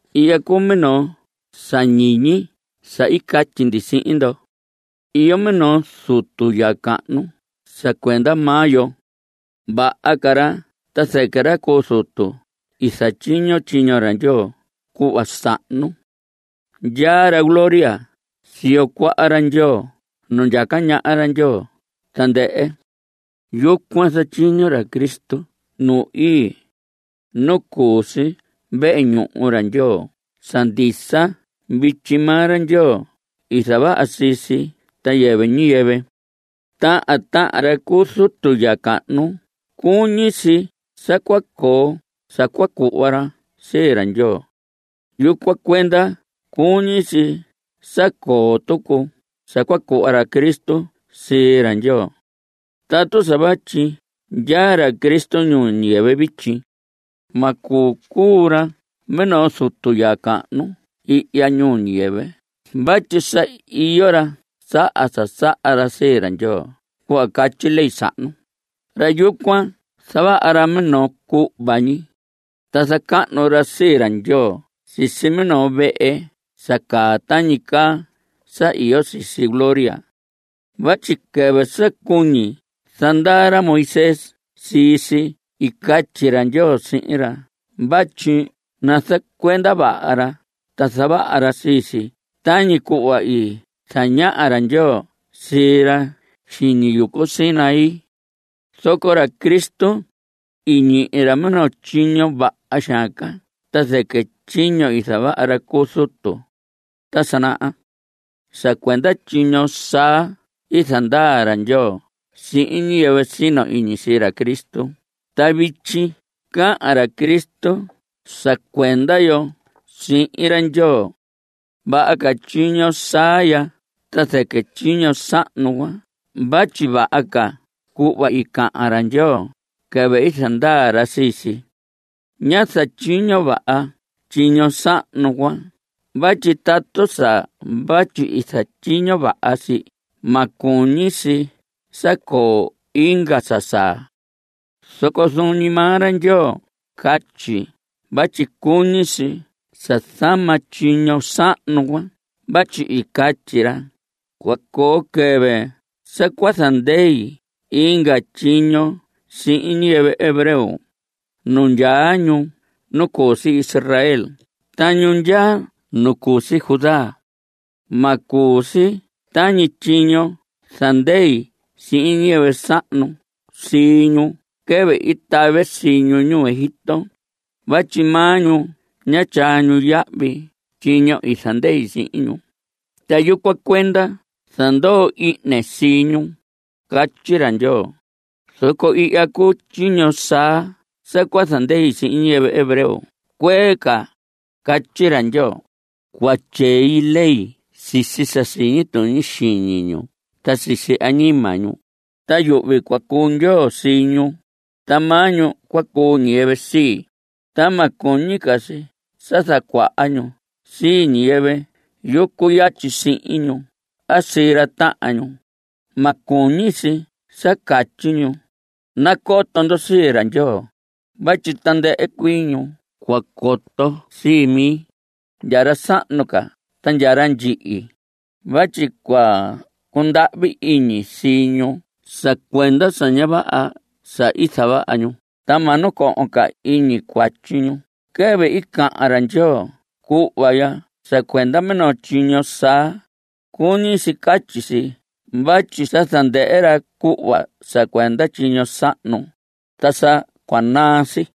Ihya cuu minoo sa ñiñi sa i catyi ndi sihin ndo. Iyo minoo zutu ya cahnu sa cuenda maa yo. Vaha ca ra ta zɨquɨ ra cu zutu i zatyiño tyiño ra Ndyoo cuhva sahnu. Ndyaa ra gloria siyo cuaha ra Ndyoo nu ndyaca ñaha ra Ndyoo tandɨhɨ. Yucuan zatyiño ra Cristo nu ii, nu cu si vehe ñuhu ra Ndyoo sa ndisa vityi. Maa ra Ndyoo i zavaha sii si ta yɨvɨ ñiyɨvɨ. Tahan tahan ra cu zutu ya cahnu cuñi si sa cua coo sa cua cuhva ra sii ra Ndyoo. Yucuan cuenda cuñi si sa coo tucu sa cua cuhva ra Cristo sii ra Ndyoo. Tatu sa vatyi ndyaa ra Cristo ñuu ñiyɨvɨ vityi, ma cuu ra minoo zutu ya cahnu ihya ñuu ñiyɨvɨ vatyi sa iyo ra saha sa saha ra sii ra Ndyoo cuhva catyi ley sahnu. Ra yucuan zavaha ra minoo cuhva ñi, ta zacahnu ra sii ra Ndyoo sisi minoo vehe sa caa tañi caa sa iyo sisi gloria. Vatyi quɨvɨ sa cuñi zandaa ra Moisés sii si i catyi ra Ndyoo sihin ra vatyi nazacuenda vaha ra ta zavaha ra sii si tañi cuhva i zañaha ra Ndyoo sii ra xiñi yucu Sinaí. Zoco ra Cristo, i ñihi ra minoo tyiño vaha xaan ca ta zɨquɨ tyiño i zavaha ra cu zutu ta sa naha. Sa cuenda tyiño saa i zandaa ra Ndyoo sihin ñiyɨvɨ sino iñi sii ra Cristo ta vityi cahan ra Cristo sa cuenda yo sihin ra Ndyoo. Vaha ca tyiño saa ya ta zɨquɨ tyiño sahnu cuan vatyi vaha ca cuhva i cahan ra Ndyoo quɨvɨ i zandaa ra sii si. Ñá zatyiño vaha tyiño sahnu cuan vatyi tatu sa vatyi i zatyiño vaha si ma cuñi si sa coo inga sa saa. Zoco zuun ñi maa ra Ndyoo catyi vatyi cuñi si sa zama tyiño sahnu cuan vatyi i catyi ra: Cua coo quɨvɨ sa cua zandei inga tyiño sihin ñiyɨvɨ hebreo, ñu ndyaa nu cu si Israel ta ñu ndyaa nu cu si Judá. Ma cuu si tañi tyiño i zandei sihin ñiyɨvɨ sahnu sii ñu quɨvɨ i tave sii ñu ñuu Egipto; Vatyi maa ñu, ña tyaa ñu yahvi tyiño i zandei sihin ñu, Ta yucuan cuenda i zandoo ihne sii ñu. Catyi ra Ndyoo. Zoco ihya cuu tyiño saa sa cua zandei sihin ñiyɨvɨ hebreo cuee ca, catyi ra Ndyoo. Cua tyei ley sisi sa siñi tuñi xiñi ñu ta sisi añima ñu; Ta yuhvi cua cuu Ndyoo sii ñu, Ta maa ñu cua cuu ñiyɨvɨ sii. Ta ma cuñi ca si sa zacuaha ñu sii ñiyɨvɨ yucu yatyi sihin ñu a sii ra tahan ñu. Ma cuñi si sa catyi ñu: “Nacoto ndo sii ra Ndyoo”; Vatyi tandɨhɨ cuii ñu cua coto sii mi, ndya ra sahnu ca ta ndya ra ndyihi. Vatyi cua cundahvi iñi sii ñu sa cuenda sa ña vaha sa i zavaha ñu, Ta ma nacohon ca iñi cuatyi ñu. Quɨvɨ i cahan ra Ndyoo cuhva ya sa cuenda minoo tyiño saa, cuñi si catyi si vatyi sa zandɨhɨ ra cuhva sa cuenda tyiño sahnu. Ta sa cua naa si.